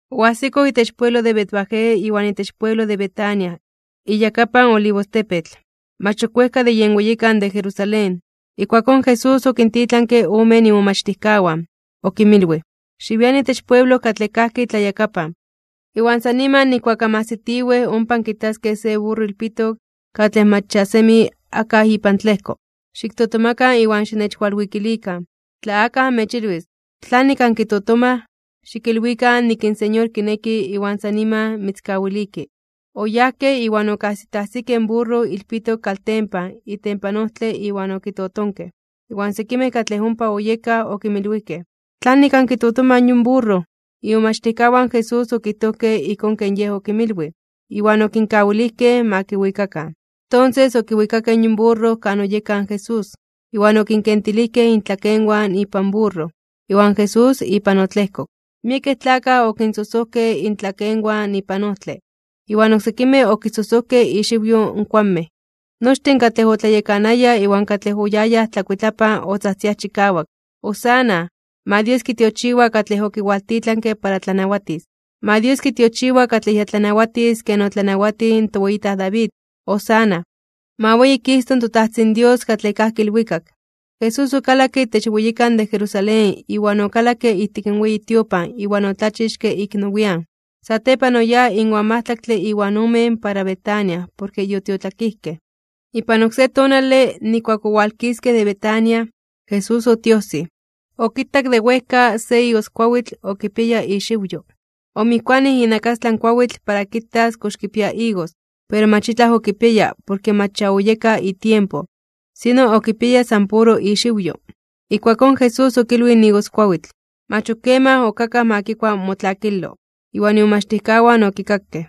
Oajsikoj itech pueblo de Betfagé iwan itech pueblo de Betania iyakapan in Olivostepetl, mach ok wejka de yen weyikan de Jerusalén. Ijkuakón Jesús okintitlanke omen imomachtijkawan. Okinmilwij: ―Xiwian itech pueblo katlej kajki tlayakapan, iwan san niman nijkuak anmajsitiwej ompa ankitaskej se burro ilpitok katlej mach ya semi akaj ipan tlejko. Xiktotomakan iwan xinechwalwikilikan. Tla akaj anmechilwis: “¿Tlanik ankitotomaj?”, xikilwikan nik in Señor kineki iwan san niman mitzkawiliki. Oyajkej, iwan okajsitajsikej in burro ilpitok kaltempan itempan ojtle iwan okitotonkej. Iwan sekimej katlej ompa oyekaj okinmilwijkej: ―¿Tlanik ankitotomaj yon burro? Imomachtijkawan in Jesús okijtojkej ijkón ken Yej okinmilwij, iwan okinkawilijkej ma kiwikakan. Tonses okiwikakej yon burro kan oyeka in Jesús, iwan okinkentilijkej intlakenwan ipan burro, iwan Jesús ipan otlejkok. Miekej tlakaj okinsojsojkej intlakenwan ipan ojtle, iwan oksekimej okisojsojkej ixiwyo in kuanmej. Nochtin katlej otlayekanayaj iwan katlej oyayaj tlakuitlapan otzajtziaj chikawak: ―¡Hosana! ¡Ma Dios kitiochiwa katlej okiwaltitlanke para tlanawatis! ¡Ma Dios kitiochiwa katlej ya tlanawatis ken otlanawatij in toweyitaj David! ¡Hosana! ¡Ma weyikisto in toTajtzin Dios katlej kajki ilwikak! Jesús okalakke itech weyikan de Jerusalén iwan okalakke ijtik in weyi tiopan iwan otlachixke ik nowian (nian nepa). Satepan oyáj inwan majtlaktle iwan omen para Betania porke yotiotlakijkej. Ipan oksé tonale, nijkuak owalkiskej de Betania, Jesús otiojsij. Okitak de wejka se igoskuawitl okipiaya ixiwyo. Omijkuanij inakastlan kuawitl para kitas kox kipia igos, pero mach itlaj okipiaya porke mach ya oyeka itiempo, sino okipiaya san puro ixiwyo. Ijkuakón Jesús okilwij in igoskuawitl: ―Mach ok keman ok akaj ma kikua motlakilo. Iwan imomachtijkawan okikakej.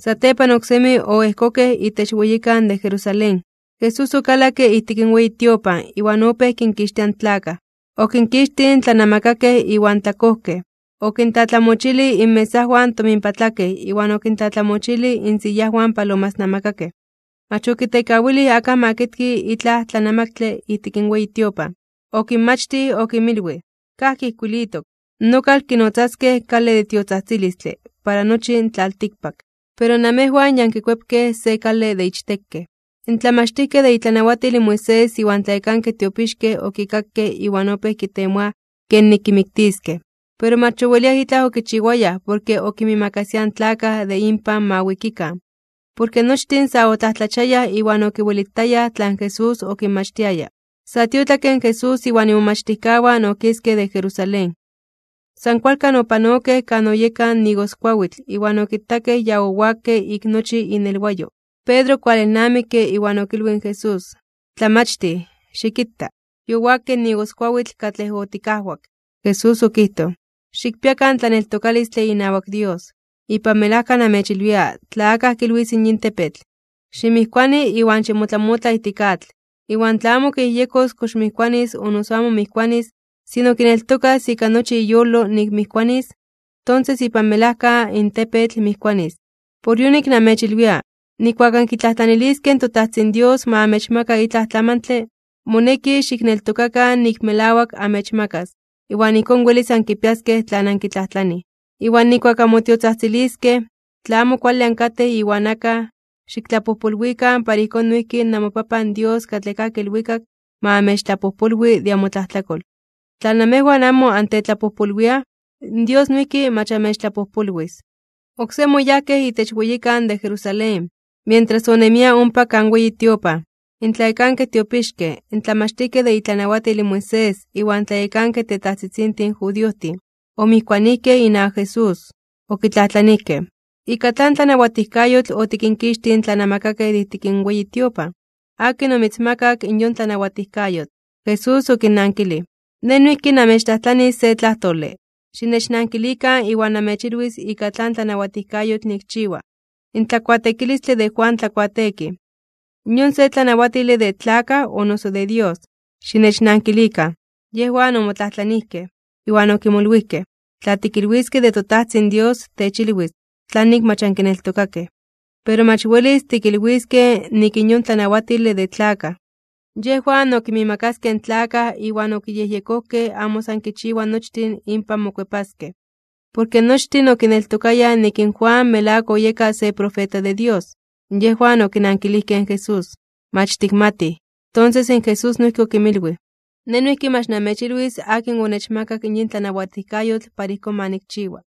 Satepan oksemi oejkokej itech weyikan de Jerusalén. Jesús okalakke ijtik in weyi tiopan iwan opéj kinkixtia in tlakaj. Okinkixtij in tlanamakakej iwan tlakojkej. Okintlatlamochilij inmesajwan in tominpatlakej iwan okintlatlamochilij insiyajwan in palomasnamakakej. Mach okitekawilij akaj ma kitki itlaj tlanamaktle ijtik in weyi tiopan. Okinmachtij okinmilwij: ―Kajki ijkuilitok: “Nokal kinotzaskej kale de tiotzajtzilistle para nochi in tlaltikpak.” Pero namejwan ya ankikuepkej se kale de ichtekej. In tlamachtijkej de itlanawatil in Moisés iwan tlayekankej tiopixkej okikakej iwan opéj kitemoaj kenik kimiktiskej. Pero mach oweliaj itlaj okichiwayaj porke okinmiimakasiaj in tlakaj de inpan ma wikikan, porke nochtin sa otlajtlachiayaj (omomajmawtiayaj) iwan okiwelitayaj tlan Jesús okinmachtiaya. Sa tiotlakke Jesús iwan imomachtijkawan okiskej de Jerusalén. San kualkan opanokej kan oyeka in igoskuawitl iwan okitakej ya owakke ik nochi inelwayo. Pedro okualelnamikke iwan okilwij in Jesús: ―¡Tlamachtij, xikita! ¡Yowakke in igoskuawitl katlej otikajwak! Jesús okijtoj: ―Xikpiakan tlaneltokalistle inawak Dios. Ipan melajka namechilwia tla akaj kilwis yin tepetl: “Ximijkuani iwan ximotlamotla ijtik atl.” Iwan tla amo kiyejyekojtos kox mijkuanis o noso amo mijkuanis, sino kineltokas ika nochi iyolo nik mijkuanis, tonses ipan melajka in tepetl mijkuanis. Por yonik namechilwia, nijkuak ankitlajtlaniliskej toTajtzin Dios ma amechmaka itlaj tlamantle, moneki xikneltokakan nik melawak amechmakas, iwan ijkón welis ankipiaskej tlan ankitlajtlanij. Iwan nijkuak anmotiotzajtziliskej, tla amo kuale ankatej iwan akaj, xiktlapojpolwikan para ijkón noijki namoPapan Dios katlej kajki ilwikak ma amechtlapojpolwi de amotlajtlakol. Tla namejwan amo antetlapojpolwiaj, Dios noijki mach amechtlapojpolwis. Oksemi oyajkej itech weyikan de Jerusalén. Mientras onemia ompa kan weyi tiopan, in tlayekankej tiopixkej, in tlamachtijkej de itlanawatil in Moisés iwan tlayekankej tetajtzitzintin judiojtin, omijkuanijkej inawak Jesús. Okitlajtlanijkej: ―¿Ika tlan tlanawatijkayotl otikinkixtij in tlanamakakej de ijtik in weyi tiopan? ¿Akin omitzmakak in yon tlanawatijkayotl? Jesús okinnankilij: ―Nej noijki namechtlajtlanis se tlajtole, xinechnankilikan iwan namechilwis ika tlan tlanawatijkayotl nikchiwa. In tlakuateekilistle de Juan Tlakuateekij, ¿yon se tlanawatile de tlakaj o noso de Dios? Xinechnankilikan. Yejwan omotlajtlanijkej, iwan okimolwijkej: ―Tla tikilwiskej de toTajtzin Dios, techilwis: “¿Tlanik mach ankineltokakej?” Pero, mach welis tikilwiskej nik yon tlanawatile de tlakaj. Yejwan okinmiimakaskej in tlakaj iwan okiyejyekojkej amo san kichiwa nochtin inpan mokuepaskej, porke nochtin okineltokayaj nik in Juan melawak oyeka se profeta de Dios. Yejwan okinankilijkej in Jesús: ―Mach tikmatij. Tonses in Jesús noijki okinmilwij: ―Nej noijki mach namechilwis akin onechmakak yin tlanawatijkayotl para ijkón ma nikchiwa.